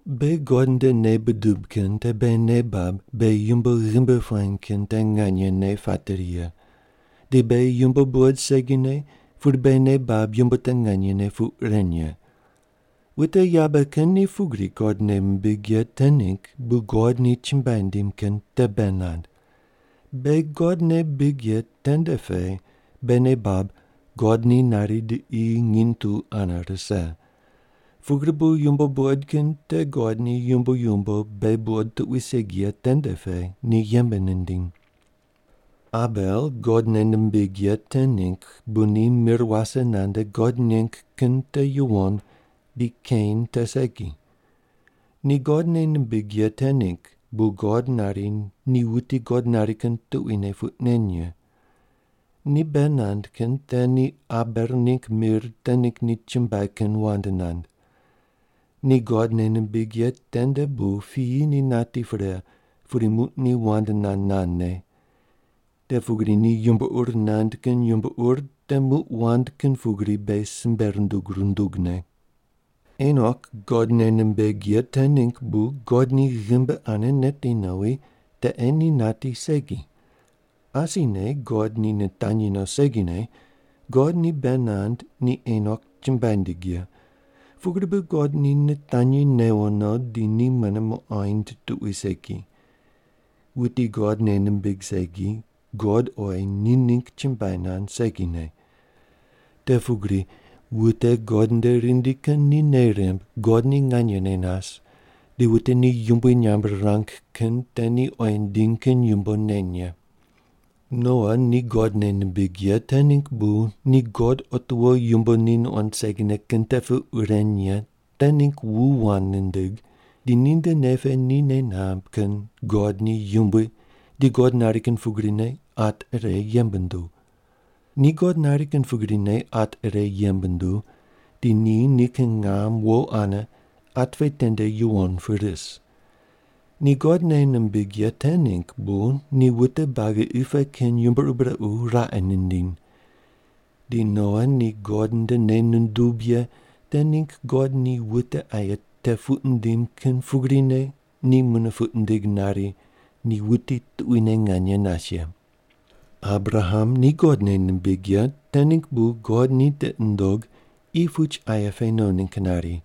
Beghi God nde nei budub kin te beghi nei bab beghi yumbo ghimbi puany kin te nganyene pateri ye, di beghi yumbo buqod segine pudi beghi nei bab yumbo te nganyene puq ren ye. Wute yabe kin ni pugri God nei mimbig ye te ningg bu God ni chumbuai nindim kin te bei nand. Beghi God nei bibig ye tende pe beghi nei bab God ni nari di qi nginy tu ane rise. Pugri bu yumbo buqod kin te God ni yumbo yumbo beghi buqod tuqui segi ye tende pe ni yembe nindiny. Abel God nei nimbig ye te ningg bu ni mir wase nande God neng kin te yuwon di Kein te segi. Ni God nei nimbig ye te ningg bu God nari ni wuti God nari kin tuquine puq nen ye. Ni bei nand kin te ni Abel ningg mir te ningg ni chumbuai kin wand nand. Ni God nei nimbig ye tende bu piyi ni nati pre pudi muq ni wand nand nandne. Te pugri ni yumbo ur nand kin yumbo ur te muq wand kin pugri beghi simbe rundug rundugne. Enok God nei nimbig ye te ningg bu God ni ghimbi ane neti nowi, te ei ni nati segi. Asine God ni nitanyi no segine, God ni bei nand ni Enok chumbuai nindig ye. Pugri bu God ni nitanyi newo no di ni mune muqoind tuqui segi. Wuti God nei nimbig segi, God oyi ni ningg chumbuai nand segine. Te pugri wute God nde rindi kin ni nei rimb God ni nganyene nas di wute ni yumbui nyamb rirang kin te ni oyi nindiny kin yumbo neny ye. Noa ni God nei nimbig ye te ningg bu ni God otiwo yumbo ni nuqond segine kin te puq ren ye te ningg wu wand nindig di ninde nei pe ni nei namb kin God ni yumbui di God nari kin pugrine at ire yembe nunduw. Ni God nari kin pugrine at ire yembe nunduw di ni nikin ngam wo ane at pe tende yuwon pu ris. Ni God nei nimbig ye te ningg bu ni wute buagi qi pe kin yumbo ur brequ raqe nindiny. Di Noa ni God nde nei nundub ye te ningg God ni wute aye te puq nindim kin pugrine ni mune puq nindig nari ni wuti tuquine nganye nas ye. Abraham ni God nei nimbig ye te ningg bu God ni tiqi nundog qi puch aye pe no ningg nari,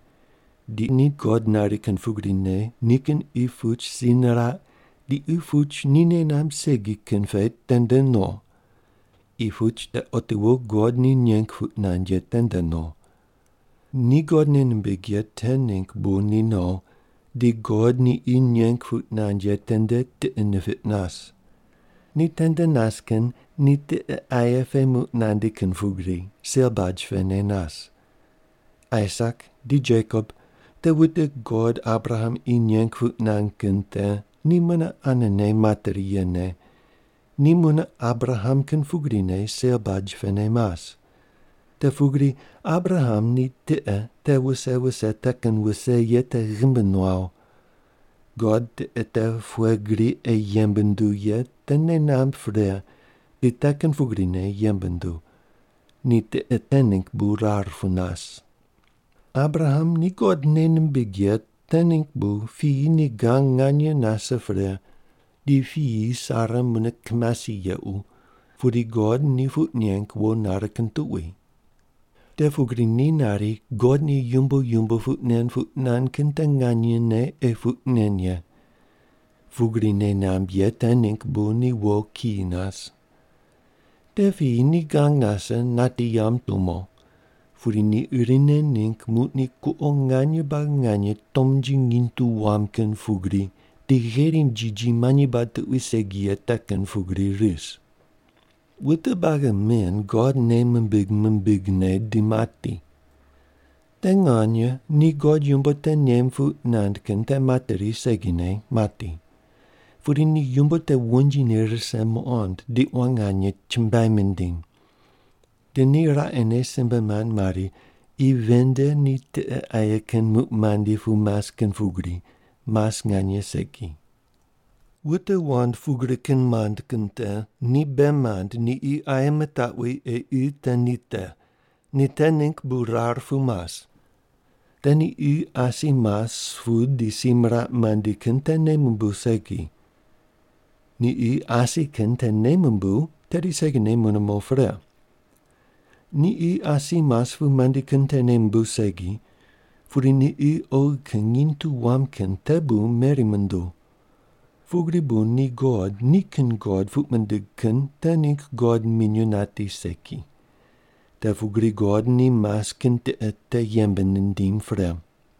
di ni God nari kin pugrine nikin qi puch si niraq di qi puch ni nei namb segi kin pe tende no. Qi puch te otiwo God ni neng puq nand ye tende no. Ni God nei nimbig ye te ningg bu ni no di God ni qi neng puq nand ye tende tiqe nipiq nas. Ni tende nas kin ni tiqe aye pe muq nandi kin pugri sel baj pene nas. Aisak di Jekop, te wute God Abraham qi neng puq nand kin te ni mune anene materi yene, ni mune Abraham kin pugrine sel baj pene mas. Te pugri Abraham ni tiqe te wuse wuse te kin wuse ye te ghimbi nuaw. God tiqe te pughe gri ei yembe nunduw ye te nei namb pre di te kin pugrine yembe nunduw. Ni tiqe te ningg bu rar pu nas. Abraham ni God nei nimbig ye te ningg bu piyi ni gang nganye nase pre di piyi Sara mune kimasi yequ pudi God ni puq neng wo nare kin tuqui. Te pugri ni nari God ni yumbo yumbo puq nen puq nand kin te nganyene ei puq nen ye. Pugri nei namb ye te ningg bu ni wo kiyi nas. Te piyi ni gang nase nati yamb tumo, pudi ni irine ningg muq ni kuqo nganye buagi nganye tomnji nginy tu wam kin pugri di gherim jiji manyi bad tuqui segi ye te kin pugri ris. Wute buagi men God nei mimbig mimbigne di mati. Te nganye ni God yumbo te nem puq nand kin te materi segine mati, pudi ni yumbo te wonjine rise muqond di quan nganye chumbuai mindiny. Di ni raqene simbe mand mari qi ven nde ni tiqe aye kin muq mandi pu mas kin pugri, mas nganye segi. Wute wand pugri kin mand kin te ni bei mand ni qi aye mitaqwi ei qi te ni te. Ni te ningg bu rar pu mas. Te ni qi asi mas pu di si miraq mandi kin te nei mumbuw segi. Ni qi asi kin te nei mumbuw tedi segine mune mo pre. Ni qi asi mas pu mandi kin te nei mumbuw segi, pudi ni qi oghi kin nginy tu wam kin te bu meri munduw. Pugri bu ni God nikin God puq mindig kin te ningg God minyuw nati segi. Te pugri God ni mas kin tiqe te yembe nindim pre.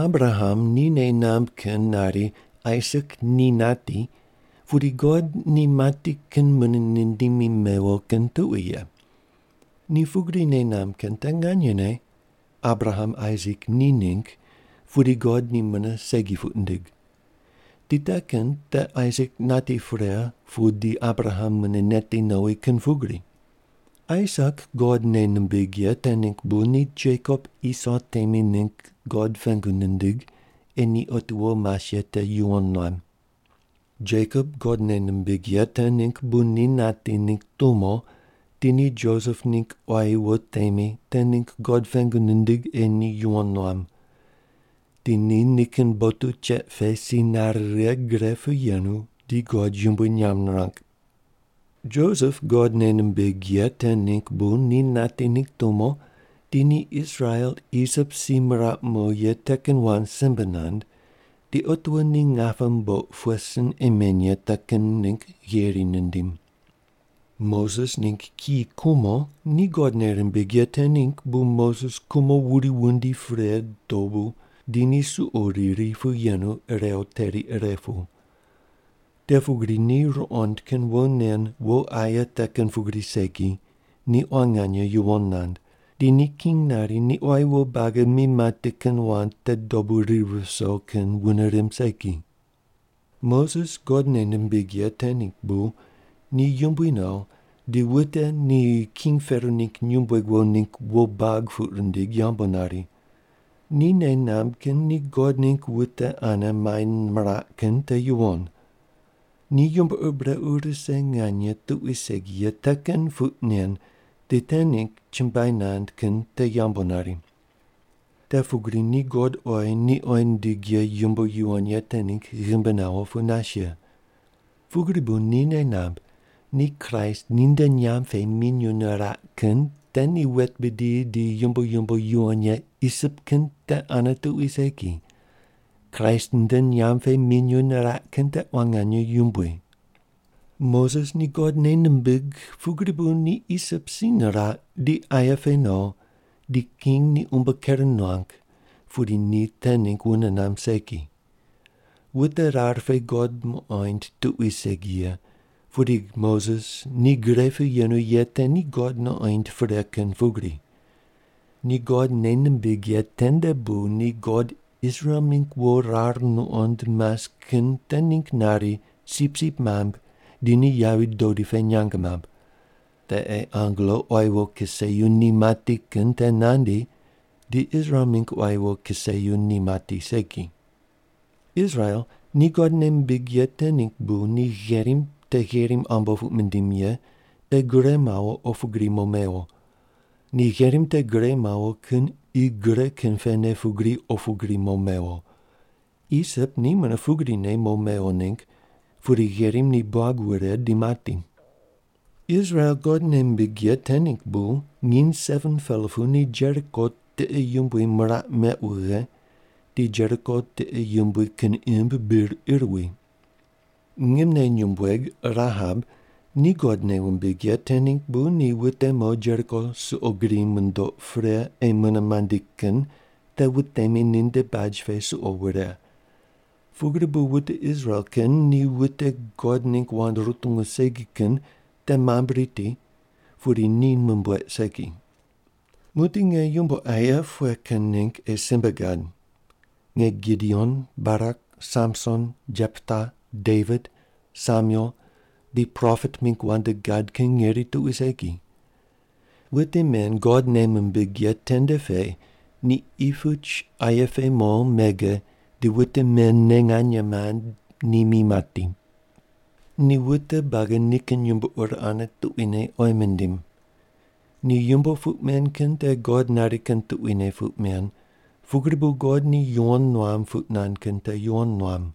Abraham ni nei namb kin nari Aisak ni nati pudi God ni mati kin mune nindimi mewo kin tuqui ye. Ni pugri nei namb kin te nganyene, Abraham Aisak ni ningg pudi God ni mune segi puq nindig. Di te kin te Aisak nati pre pu di Abraham mune neti nowi kin pugri. Aisak God nei nimbig ye te ningg bu ni Jekop Iso temi ningg God pengu nindig ei ni otiwo mas ye te yuwon nuam. Jekop God nei nimbig ye te ningg bu ni nati ningg tumo di ni Josep ningg quayi wo temi te ningg God pengu nindig ei ni yuwon nuam. Di ni nikin botu cheq pe si nare righe gre pu yenu di God yumbui nyamb nirang. Josep God nei nimbig ye te ningg bu ni nati ningg tumo di ni Israel Isip si miraq mo ye te kin wand simbe nand, di otiwo ni ngape mboq pughe sin ei meny ye te kin ningg yeri nindim. Moses ningg kiyi kumo ni God nei rimbig ye te ningg bu Moses kumo wuri wundi pre dobu di ni suqo riri pu yenu irew teri ire pu. Te pugri ni ruqond kin wo nen wo aye te kin pugri segi ni quan nganye yuwon nand, di ni king nari ni quayi wo buagi mi mati kin wand te dobu ri viso kin wune rimb segi. Moses God nei nimbig ye te ningg bu ni yumbui no di wute ni king Pero ningg nyumbueg wo ningg wo bag puq rindig yambu nari. Ni nei namb kin ni God ningg wute ane mai miraq kin te yuwon. Ni yumbo ur brequ rise nganye tuqui segi ye te kin puq nen di te ningg chumbuai nand kin te yambu nari. Te pugri ni God oyi ni oyi nindig ye yumbo yuwon ye te ningg ghimbi nawo pu nas ye. Pugri bu ni nei namb ni Kraist ninde nyamb pe minyuw niraq kin te ni wet bidi di yumbo yumbo yuwon ye Isip kin te ane tuqui segi, Kraist nde nyamb pe minyuw niraq kin te quan nganye yumbui. Moses ni God nei nimbig pugri bu ni Isip si niraq di aye pe no di king ni umbo ker nuang pudi ni te ningg wune namb segi. Wute rar pe God muqoind tuqui segi ye, pudi Moses ni gre pu yenu ye te ni God nuqoind pre kin pugri. Ni God nei nimbig ye tende bu ni God Israel mingg wo rar nuqond mas kin te ningg nari sipsip mambui di ni yavi dodi pe nyang mamb. Te ei angelo quayi wo kiseyu ni mati kin te nandi di Israel mingg quayi wo kiseyu ni mati segi. Israel ni God nei mimbig ye te ningg bu ni gherim te Gherim Ambo puq mindiny ye te gure mawo opu gri mo mewo. Ni gherim te gure mawo kin qi gre kin pene pugri opu gri mo mewo. Isip ni mune pugrine mo mewo ningg pudi gherim ni buag wure di mati. Israel God nei mimbig ye te ningg bu nginy 7-pela pu ni Jeriko tiqe yumbui miraq meq wughe di Jeriko tiqe yumbui kin imb bir ir wi. Ngimne nyumbueg Rahab ni God nei wumbig ye te ningg bu ni wute mo Jeriko suqo grine mundoq pre ei mune mandi kin te wutemi ninde baj pe suqo wure. Pugri bu wute Israel kin ni wute God ningg wand rutungu segi kin te mambui riti pudi ni mumbueq segi. Muq di nge yumbo aye pughe kin ningg ei simbe gad? Nge Gideon, Barak, Samson, Jepta, Devit, Samuel di propet mingg wand gad kin ngeri tuqui segi. Wute men God nei mimbig ye tende pe ni qi puch aye pe mo mege di wute men ne nganye mand ni mi mati. Ni wute buagi nikin yumbo ur ane tuquine oyi mindim. Ni yumbo puq men kin te God nari kin tuquine puq men pugri bu God ni yuwon nuam puq nand kin te yuwon nuam.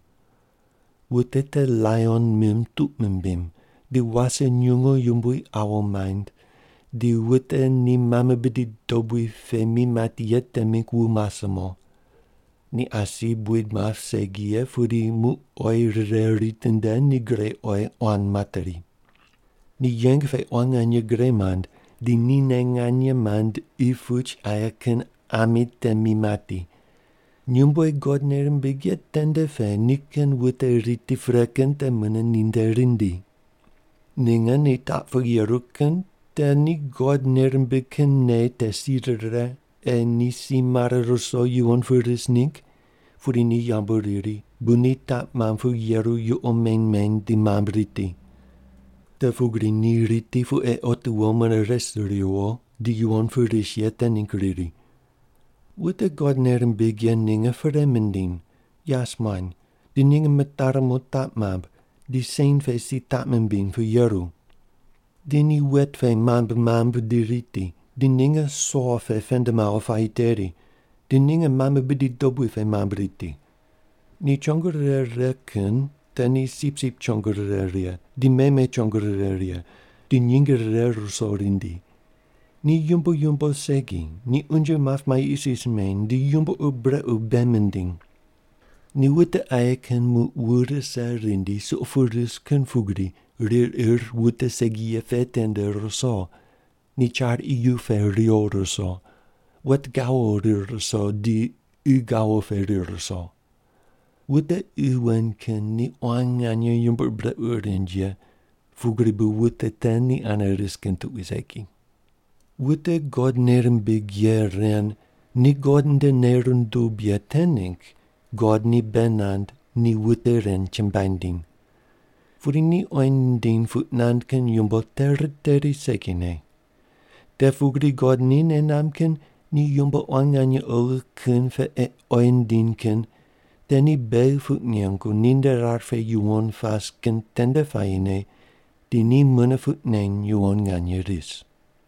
Wute te laion mim tuq mimbiny, di wase nyungu yumbui awu maind, di wute ni mame bidi dobui pe mi mati ye te mingg wu mase mo. Ni asi buid map segi ye pudi muq oyi rire ritinde ni gre oyi quan materi. Ni yeng pe quan nganye gre mand di nine nganye mand qi puch aye kin ami te mi mati. Nyumbueg God nei rimbig ye tende pe nikin wute riti pre kin te mune ninde rindi. Ninge ni taq pu yeru kin te ni God nei rimbig kin nei te si rire ei ni si mare ruso yuwon pu ris ningg pudi ni yambu riri bu ni taq mamb pu yeru yuqo meny meny di mambui riti. Te pugri, ni riti pu ei otiwo mune res riwo di yuwon pu ris ye te ningg riri. Wute God nei rimbig ye ninge perei mindiny, yas muany, di ninge mitari mo taq mamb di sen pe si taq mimbiny pu yeru. Di ni wet pe mambui mambui di riti, di ninge so pe pend mawo puayi teri, di ninge mame bidi dobui pe mambui riti. Ni chongo rire righe kin te ni sipsip chongo rire righe di meme chongo rire righe di nyinge rire ruso rindi. Ni yumbo yumbo segi, ni unje map mai isis meny, di yumbo ur brequ bei mindiny. Ni wute aye kin muq wu rise rindi suqo pu ris kin pugri rir ir qi wute segi ye pe tende ruso, di char iyu pe riwo ruso, wet gawo rir ruso di qi gawo pe rir ruso. Wute qi wen kin ni quan nganye yumbo ur brequ rind ye pugri bu wute te ni ane ris kin tuqui segi. Wute God nei rimbig ye ren ni God nde nei rundub ye te ningg God ni bei nand ni wute ren chumbuai nindiny. Pudi ni oyi nindiny puq nand kin yumbo te riteri segine. Te pugri God ni nei namb kin ni yumbo quan nganye oghi kin pe ei oyi nindiny kin te ni beghi puq nengu ni nde rar pe yuwon pas kin tende puayine di ni mune puq neny yuwon nganye ris.